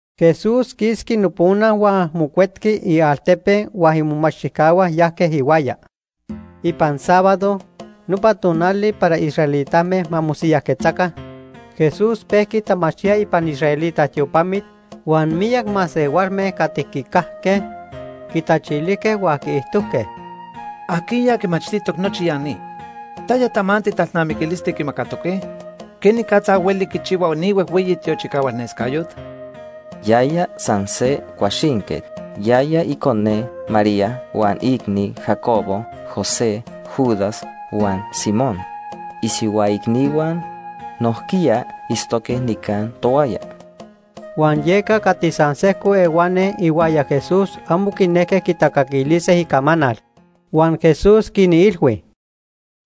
Jesús quisqui nopona huan mocuetqui ialtepe huan imomachtijcahua yajque ihuaya. Ipan sábado, nopa tonali para israelitame ma mosiyajquetzaca, Jesús pejqui tamachtía ipan israelita tiopamit huan miyac masehualme cati quicajque quitachilijque huan quiijtojque: ―¿Ajquiya quimachtijtoc nochi ya ni? ¿Taya tamanti talnamiquilisti quimacatoque? ¿Quenicatza hueli quichihua ni huejhueyi tiochicahualnescayot? Yaya san se cuaxinquet. Yaya icone María huan iicni Jacobo, José, Judas, huan Simón. Isihua icnihua nojquiya itztoque nica tohuaya. Huan yeca cati san sejco ehuani ihuaya Jesús amo quinejque quitacaquilise icamanal. Huan Jesús quinilhui: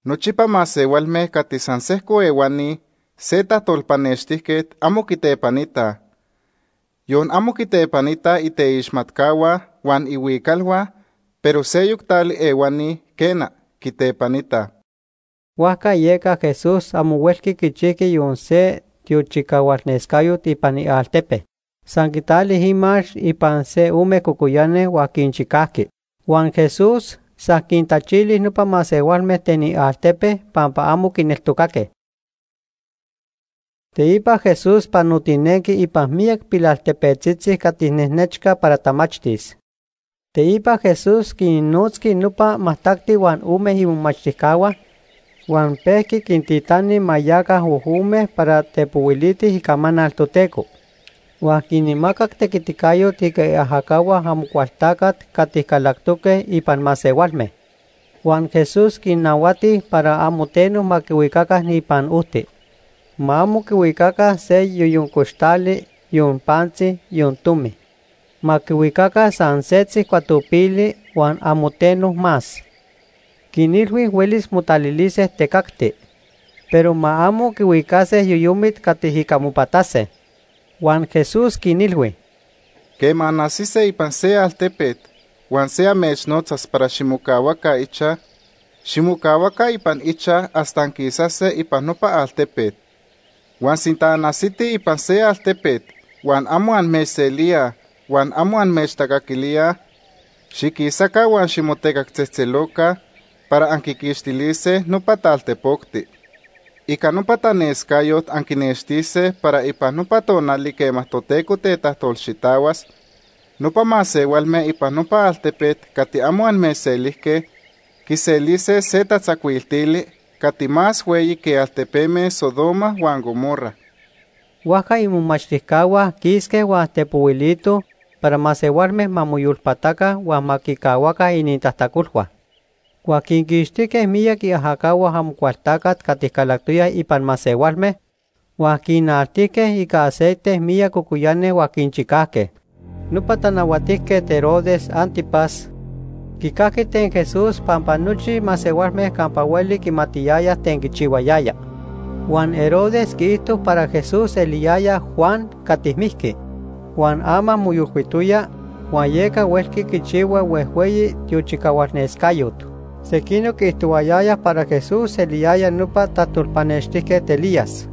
―Nochipa masehualme cati san sejco ehuani se tajtolpanextijquet amo quitepanitaj. Yon amo quitepanitaj iteixmatcahua huan ihuicalhua, pero seyoc tali ehuani, quena, quitepanitaj. Huajca yeca Jesús amo huelqui quichijqui yon se tiochicahualnescayot ipan ialtepe. San quitali imax ipan se ome cocoyani huan quinchicajqui. Huan Jesús san quintachili nopa masehualme ten ialtepe pampa amo quineltocaque. Teipa Jesús panotinenqui ipan miyac pilaltepetzitzi cati nejnechca para tamachtis. Teipa Jesús quinnotzqui nopa majtacti huan ome imomachtijcahua huan pejqui quintitani ma yaca ojome para tepohuilitij icamanal Toteco. Huan quinmacac tequiticayot ica iajacahua Amocualtacat cati calactoque ipan masehualme. Huan Jesús quinnahuati para amo teno ma quihuicaca ipan ojti. Ma amo quihuicaca se yoyon coxtali, yon pantzi, yon tomi. Ma quihuicaca san setzi cuatopili huan amo teno más. Quinilhui huelis motalilise tecacti, pero ma amo quihuicase yoyomit cati ica mopatase. Huan Jesús quinilhui: ―Quema anajsise ipan se altepet huan se amechnotzas para ximocahuaca ichaj, ximocahuaca ipan ichaj hasta anquisase ipan nopa altepet. Huan sinta anajsitij ipan se altepet huan amo amechselíaj huan amo amechtacaquilíaj, xiquisaca, huan ximotecactzejtzeloca para anquiquixtilise nopa taltepocti. Ica nopa tanescayot anquinextise para ipan nopa tonali quema Toteco tetajtolxitahuas, nopa masehualme ipan nopa altepet cati amo amechselijque quiselise se tatzacuiltili cati más hueyi que altepeme Sodoma huan Gomorra. Huajca imomachtijcahua quisque huan tepohuilitoj para masehualme ma moyolpataca huan ma quicahuaca inintajtacolhua. Huan quinquixtijque miyac iajacahua Amocualtacat cati calactoyaj ipan masehualme huan quinaltijque ica aceite miyac cocoyani huan quinchicajque. Nopa Tanahuatijquet Herodes Ántipas quicajqui ten Jesús pampa nochi masehualme campa hueli quimatiyayaj ten quichihuayaya. Huan Herodes quiijto para Jesús eliyaya Juan cati mijqui, huan ama moyolcuitoya, huan yeca huelqui quichihua huejhueyi tiochicahualnescayot. Sequinoc quiijtohuayayaj para Jesús eliyaya nopa tajtolpanextijquet Elías.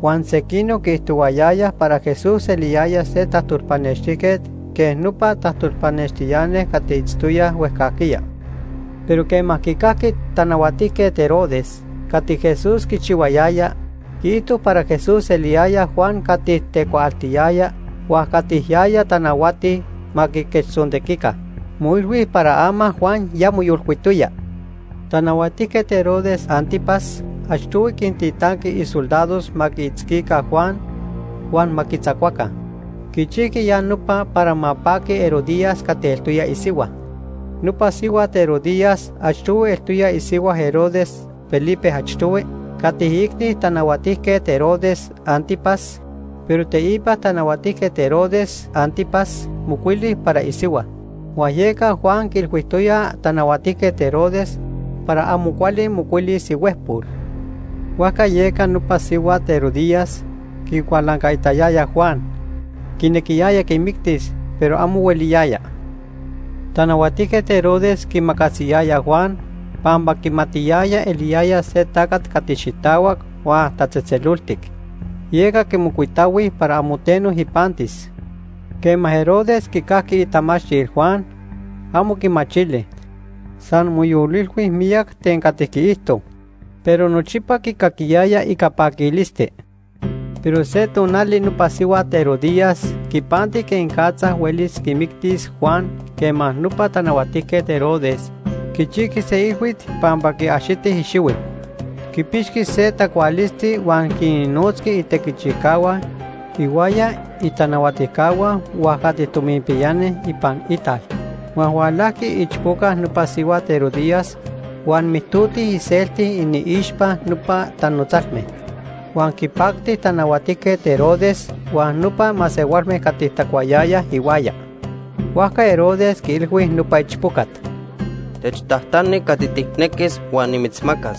Huan sequinoc quiijtohuayayaj para Jesús eliyaya se tajtolpanextijquet quej nopa tajtolpanextiani cati itztoyaj huejcajquiya. Pero quema quicajqui Tanahuatijquet Herodes cati Jesús quichihuayaya, quiijto para Jesús eliyaya Juan cati tecuaaltiyaya huan cati yaya tanahuati ma quiquechtzontequica. Moilhui para ama Juan ya moyolcuitoya. Tanahuatijquet Herodes Ántipas achtohui quintitanqui isoldados ma quiitzquica Juan huan ma quitzacuaca. Quichijqui ya nopa para ma paqui Herodías cati eltoya isihua. Nopa sihuat Herodías achtohui eltoya isihua Herodes Felipe I cati iicni Tanahuatijquet Herodes Ántipas, pero teipa Tanahuatijquet Herodes Ántipas mocuili para isihua. Huan yeca Juan quiilhuijtoya Tanahuatijquet Herodes para amo cuali mocuilis ihuejpol. Huajca yeca nopa sihuat, Herodías, quicualancaitayaya Juan. Quinequiyaya quimictis, pero amo hueliyaya. Tanahuatijquet Herodes quiimacasiyaya Juan pampa quimatiyaya eliyaya se tacat cati xitahuac huan tatzejtzeloltic, yeca quimocuitahui para amo teno ipantis. Quema Herodes quicajqui itamachtil Juan, amo quimachili. San moyolilhui miyac ten cati quiijto. Pero nochipa quicaquiyaya ica paquilisti. Pero se tonali nopa sihuat Herodías quipanti quenicatza huelis quimictis Juan quema nopa Tanahuatijquet Herodes quichijqui se ilhuit pampa quiaxiti ixihui. Quipixqui se tacualisti huan quinnotzqui itequichijcahua ihuaya itanahuatijcahua huan cati tominpiyani ipan ital. Huan hualajqui iichpoca nopa sihuat Herodías huan mijtoti iselti iniixpa nopa tanotzalme. Huan quinpacti Tanahuatijquet Herodes huan nopa masehualme cati tacuayayaj ihuaya. Huajca Herodes quiilhui nopa ichpocat: ―Techtajtani cati tijnequis huan nimitzmacas.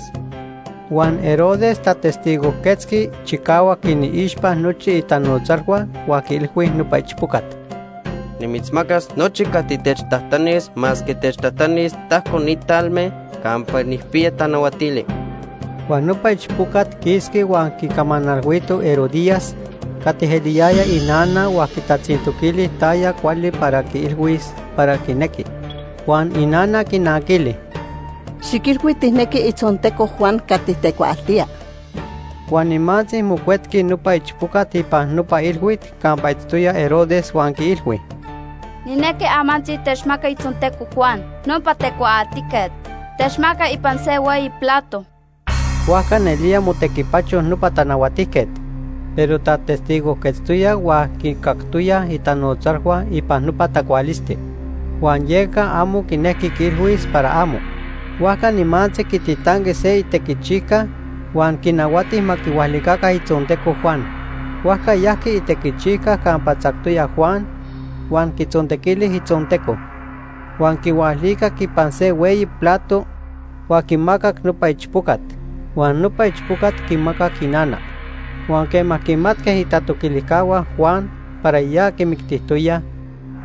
Huan Herodes tatestigojquetzqui chicahuac iniixpa nochi itanotzalhua huan quiilhui nopa ichpocat: ―Nimitzmacas nochi cati techtajtanis masque techtajtanis tajco ni talme campa nijpiya tanahuatili. Huan nopa ichpocat quisqui huan quicamanalhuito Herodías, cati eliyaya inana huan quitatzintoquili taya cuali para quiilhuis para quinequi. Huan inana quinanquili: ―Xiquilhui tijnequi itzonteco Juan cati tecuaaltía. Huan nimantzi mocuetqui nopa ichpocat ipan nopa ilhuit campa itztoya Herodes huan quiilhui: ―Nijnequi amantzi techmaca itzonteco Juan, nopa tecuaaltijquet. Techmaca ipan se hueyi plato. Huajca nelía motequipacho nopa tanahuatijquet. Pero tatestigojquetztoya huan quicactoyaj itanotzalhua ipan nopa tacualisti, huan yeca amo quinejqui quiilhuis para amo. Huajca nimantzi quititanqui se itequichijca huan quinahuati ma quihualica itzonteco Juan. Huajca yajqui itequichijca campa tzactoya Juan huan quitzontequili itzonteco. Huan quihualicac ipan se hueyi plato, huan quimacac nopa ichpocat, huan nopa ichpocat quimacac inana. Huan quema quimatque itatoquilijcahua Juan para ya quimictijtoyaj,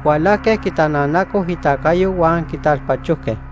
hualajque quitananacoj itacayo huan quitalpachojque.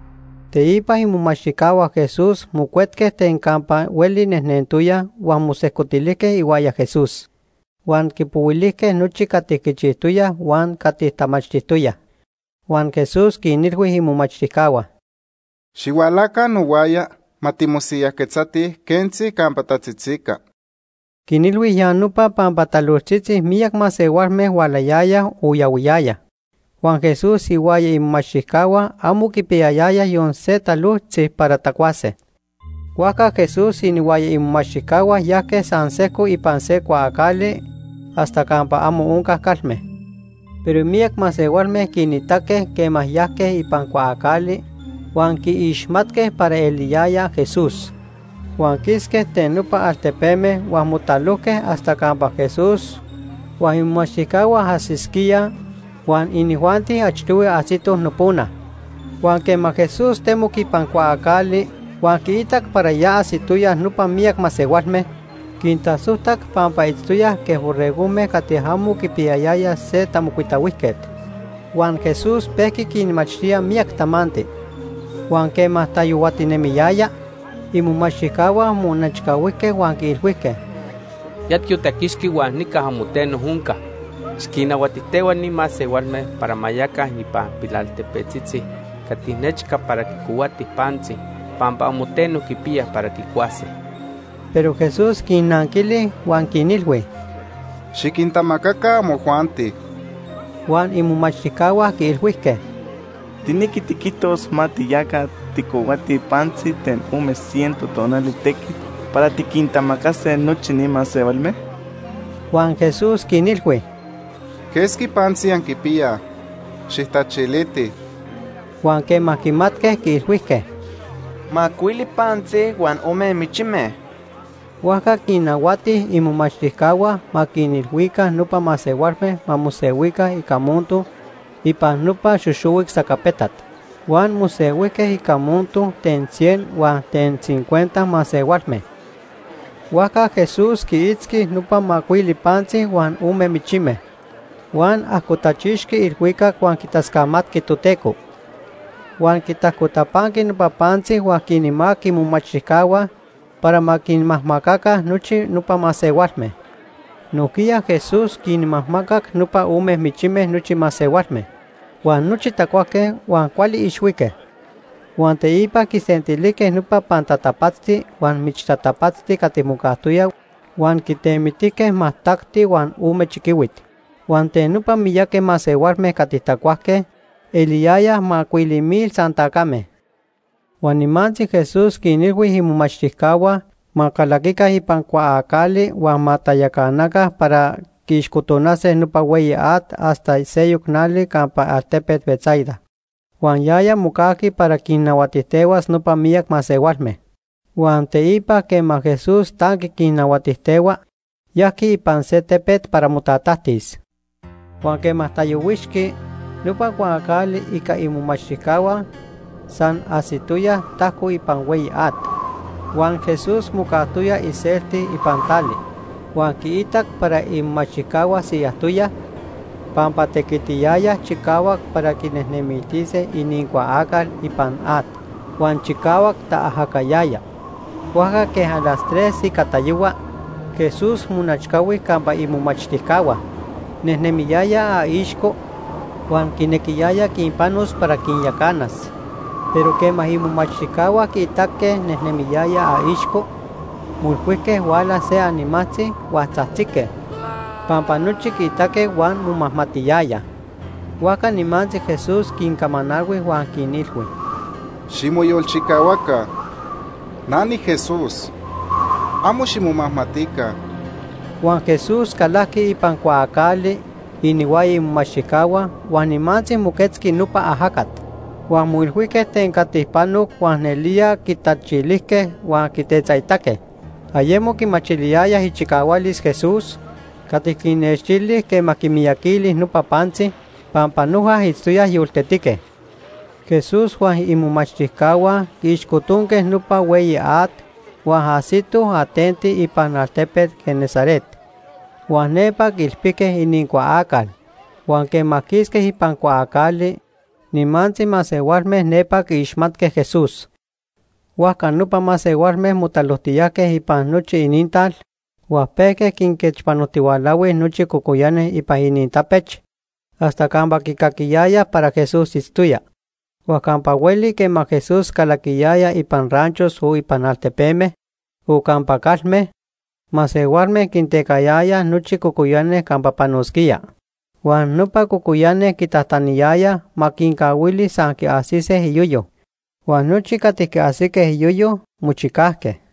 Teipa imomachtijcahua Jesús mocuetque ten campa hueli nejnentoyaj huan mosejcotilijque ihuaya Jesús. Huan quipohuilijque nochi cati quichijtoyaj huan cati tamachtijtoyaj. Huan Jesús quinilhui imomachtijcahua: ―Xihualaca nohuaya ma timosiyajquetzatij quentzi campa tatzitzica. Quinilhui ya nopa pampa talojtzitzi miyac masehualme hualayayaj o yahuiyayaj, huan Jesús ihuaya imomachtijcahua amo quipiyayayaj yon se talojtzi para tacuase. Huajca Jesús inihuaya imomachtijcahua yajque san sejco ipan se cuaacali hasta campa amo onca calme. Pero miyac masehualme quinitaque quema yajque ipan cuaacali huan quiixmatque para eliyaya Jesús. Huan quisque ten nopa altepeme huan motalojque hasta campa Jesús huan imomachtijcahua ajsisquíaj, huan inijuanti achtohui ajsitoj nopona. Huan quema Jesús temoc ipan cuaacali huan quiitac para ya ajsitoyaj nopa miyac masehualme, quintasojtac pampa itztoyaj quej borregojme cati amo quipiyayayaj se tamocuitahuijquet. Huan Jesús pejqui quinmachtía miyac tamanti. Huan quema tatayohuatinemiyaya, imomachtijcahua monechcahuijque huan quiilhuijque: ―Ya tiotaquixqui huan nica amo teno onca. Xiquinnahuatijtehua ni masehualme para ma yaca ipan ranchos ipan pilaltepetzitzi cati nechca para quicohuatij pantzi pampa amo teno quipiyaj para quicuase. Pero Jesús quinnanquili huan quinilhui: ―Xiquintamacaca amojuanti. Huan imomachtijcahua quiilhuijque: ―¿Tijnequi tiquijtos ma tiyaca tijcohuatij pantzi ten ome ciento tonali tequit para tiquintamacase nochi ni masehualme? Huan Jesús quinilhui: ―¿Quesqui pantzi anquipiyaj? Xijtachilitij. Huan quema quimatque, quiilhuijque: ―Macuili pantzi huan ome michime. Huajca quinnahuati imomachtijcahua ma quinilhuica nopa masehualme ma mosehuica ica monto ipan nopa xoxohuic sacapetat. Huan mosehuijque ica monto ten cien huan ten cincuenta masehualme. Huajca Jesús quiitzqui nopa macuili pantzi huan ome michime. Huan ajcotachixqui ilhuicac huan quitascamatqui Toteco. Huan quitajcotapanqui nopa pantzi huan quinmacac imomachtijcahua para ma quinmajmacaca nochi nopa masehualme. Nojquiya Jesús quinmajmacac nopa ome michime nochi masehualme. Huan nochi tacuajque huan cuali ixhuique. Huan teipa quisentilijque nopa pantatapatzti huan michtatapatzti cati mocajtoya huan quitemitijque majtacti huan ome chiquihuit. Huan ten nopa miyaqui masehualme cati tacuajque, eliyayaj macuili mil san tacame. Huan nimantzi Jesús quinilhui imomachtijcahua ma calaquica ipan cuaacali huan ma tayacanaca para quiixcotonase nopa hueyi at hasta seyoc nali campa altepet Betsaida, huan yaya mocajqui para quinnahuatijtehuas nopa miyac masehualme. Huan teipa quema Jesús tanqui quinnahuatijtehua, yajqui ipan se tepet para motatajtis. Huan quema tayohuixqui, nopa cuaacali ica imomachtijcahua san ajsitoya tajco ipan hueyi at, huan Jesús mocajtoya iselti ipan tali. Huan quiitac para imomachtijcahua siyajtoyaj pampa tequitiyayaj chicahuac para quinejnemiltise inincuaacal ipan at huan chicahuac taajacayaya. Huajca quej las tres ica tayohua, Jesús monechcahui campa imomachtijcahua, nejnemiyaya aixco, huan quinequiyaya quinpanos para quinyacanas. Pero quema imomachtijcahua quiitaque nejnemiyaya aixco, moilhuijque huala se animajtzi, huan tzajtzique, pampa nochi quiitaque huan momajmatiyayaj. Huajca nimantzi Jesús quincamanalhui huan quinilhui: ―Ximoyolchicahuaca. Na niJesús. Amo ximomajmatica. Huan Jesús calajqui ipan cuaacali inihuaya imomachtijcahua huan nimantzi moquetzqui nopa ajacat, huan moilhuijque ten cati panoc huan nelía quitachilijque huan quitetzaitaque. Ayemo quimachiliyayaj ichicahualis Jesús cati quinnextili quema quimiyaquili nopa pantzi, pampa noja itztoyaj yoltetique. Jesús huan imomachtijcahua quiixcotonque nopa hueyi at huan ajsitoj atenti ipan altepet Genesaret, huan nepa quiilpijque inincuaacal. Huan quema quisque ipan cuaacali, nimantzi masehualme nepa quiixmatque Jesús. Huajca nopa masehualme motalojtiyajque ipan nochi inintal huan pejque quinquechpanojtihualahui nochi cocoyani ipan inintapech hasta campa quicaquiyayaj para Jesús itztoya. Huan campa hueli quema Jesús calaquiyaya ipan ranchos o ipan altepeme o campa calme, masehualme quintecayayaj nochi cocoyani campa panosquía. Huan nopa cocoyani quitajtaniyayaj ma quincahuili san quiajsise iyoyo, huan nochi cati quiajsique iyoyo, mochicajque.